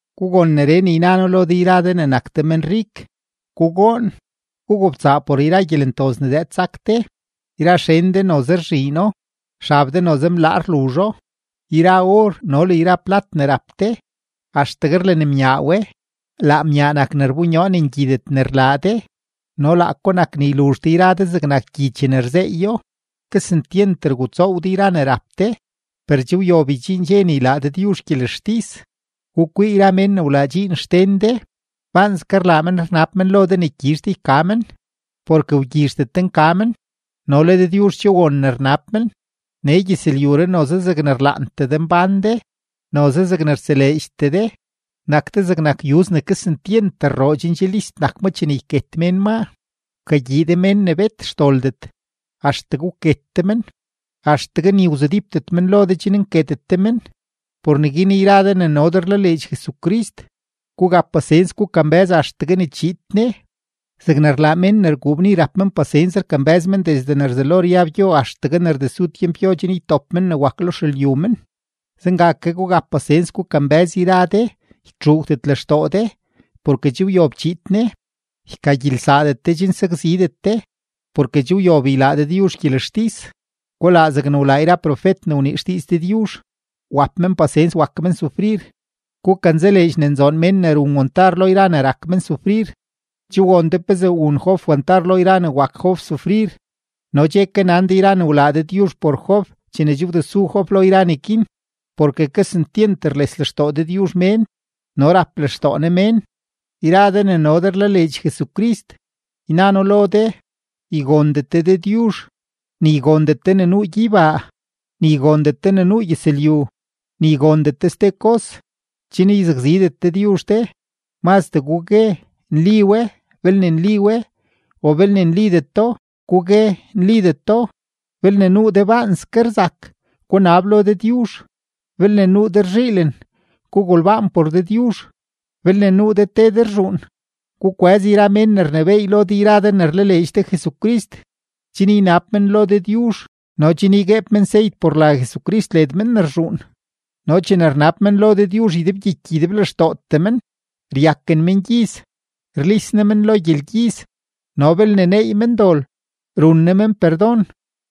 Gugon neree ne yna noo lo de yra de ne nak de menrik: Gugoon, gugobtsaa por yra gyelentoz ne zëëd sak de. Yra xen de noze rzhiino; xab de noze mlaa rluzho. Yra or no le yra plat ne rap de, axtegue rlenmyaa we; laa myaa nak ne rbonyoo ne ngyidet ne rlaa de no laako nak ne yluzh de yra de zegnak gyi chene rzeeyo. Kesentyent rgutsoow de yra ne rap de, per che wyob ydxiin dxe ne ylaa Dëdyuzh gyelextis. Gukwii yra mén ne wlaa dxiin xden de, baanske rlaa men rnab men lo de ne gyizh de yka men, porke wgyizhdet de nka men; no le Dëdyuzh che won ne rnab men. Nee gyëzlyuree noze zegne rlaantee de mbán de, noze zeg rtseleedxtee de; nak de zegnak yuz ne kesentyent rroo chen che list nak ma chene yket mén maa. Wkagyii de mén ne bet xdoldet, axtegue wket de men, axtegue ni wzudípdet men lo de chen nketet de men. Por neguin yra de ne no de rlaleedx Jesucrist, gugap pasens gukambë́z axtegue ne chiid Ne; zegne rlaa mén ne rguu bni rap men pasens rkambë́z men desde ne rzelo ryab gyo axtegue ne rdesu tyempgyo chen ytop men ne wak lo xelyu men, zenga ke gugap pasens gukambë́z yra de, ytxuugdet lextoo de, porke che wyob chiid Ne. Ykagyilsaadet de chen sakzidet de, porke che wyob ylaa Dëdyuzh gyelextis. Gulaa zegne wlaa yra profet ne wnii xdiiz Dëdyuzh, wap men pasens wak men sufrir. Gukanzaleedx ne nzoon mén ne run wantar lo yra ne rak men sufrir. Che won de pezee wun Job wantar lo yra ne wak Job sufrir no che ke nan de yra ne wlaa Dëdyuzh por Job chene che wdesu Job lo yra neguin. Porke kesentyent rles lextoo Dëdyuzh mén no rap lextoo Ne mén. Yra de ne no de rlaleedx Jesucrist, yna noo lo de, ygondet de Dëdyuzh, ni ygondet de ne nuu gyeybaa, ni ygondet de ne nuu gyëzlyu, ni ygondet de ste kos, chen yzakzidet Dëdyuzh de. Mazdee gugue “Nli we” belne nli we, o belne nlideto, gugue “Nlideto”. Belne nuu de baanske rzak, gunab lo Dëdyuzh. Belne nuu de rzhiilen, gugolbaan por Dëdyuzh. Belne nuu de te de rzhuun, gukwëz yra mén ne rnebééy lo de yra de ne rlaleedx de Jesucrist, chen ynab men lo Dëdyuzh no chen ygueeb men seyt por la Jesucrist led men ne rzhuun. No chene rnab men lo Dëdyuzh ydebgyiky ydeblextootee men, ryaken mengyiz, rlis Ne men lo gyelgyiz, no belne neey men dol, run Ne men perdon.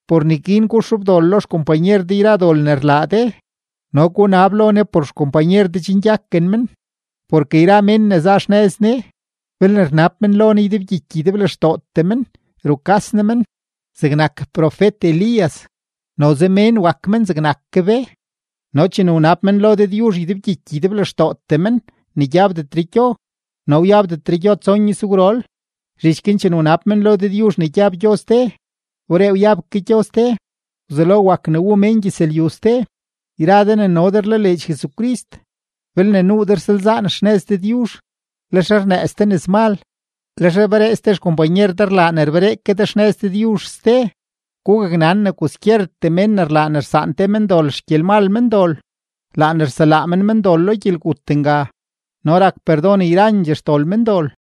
Por neguin guxobdol lo xkompanyer de yra dol ne rlaa de, no gunab lo Ne por xkompanyer de chen gyaken men. Porke yra mén ne za xnëz Ne, belne rnab men lo Ne ydebgyiky ydeblextootee men, rukas Ne men. Zegnak profet-Elías, noze mén wak men zegnak ke be, no chene wnab men lo Dëdyuzh ydebgyiky ydeblextootee men ne gyabdetre gyo, no wyabdetre gyo tson izgwrol. Zhich guin chene wnab men lo Dëdyuzh ne gyab gyo ste, wberee wyab ke gyo ste. Wzelo wak ne wu mén gyëzlyu ste. Yra de ne no de rlaleedx Jesucrist, belne nuu de rsalzaan xnëz Dëdyuzh, lex rnëëz de nëzmal, lex rberee ste xkompanyer de rlaa ne rberee ke de xnëz Dëdyuzh ste, gugaknan ne kwaskyertee mén ne rlaa ne rsaan te mendol xgyelmal mendol, laa ne rselaa men mendol lo gyelgut nga no rak perdon yrandxee xdol mendol.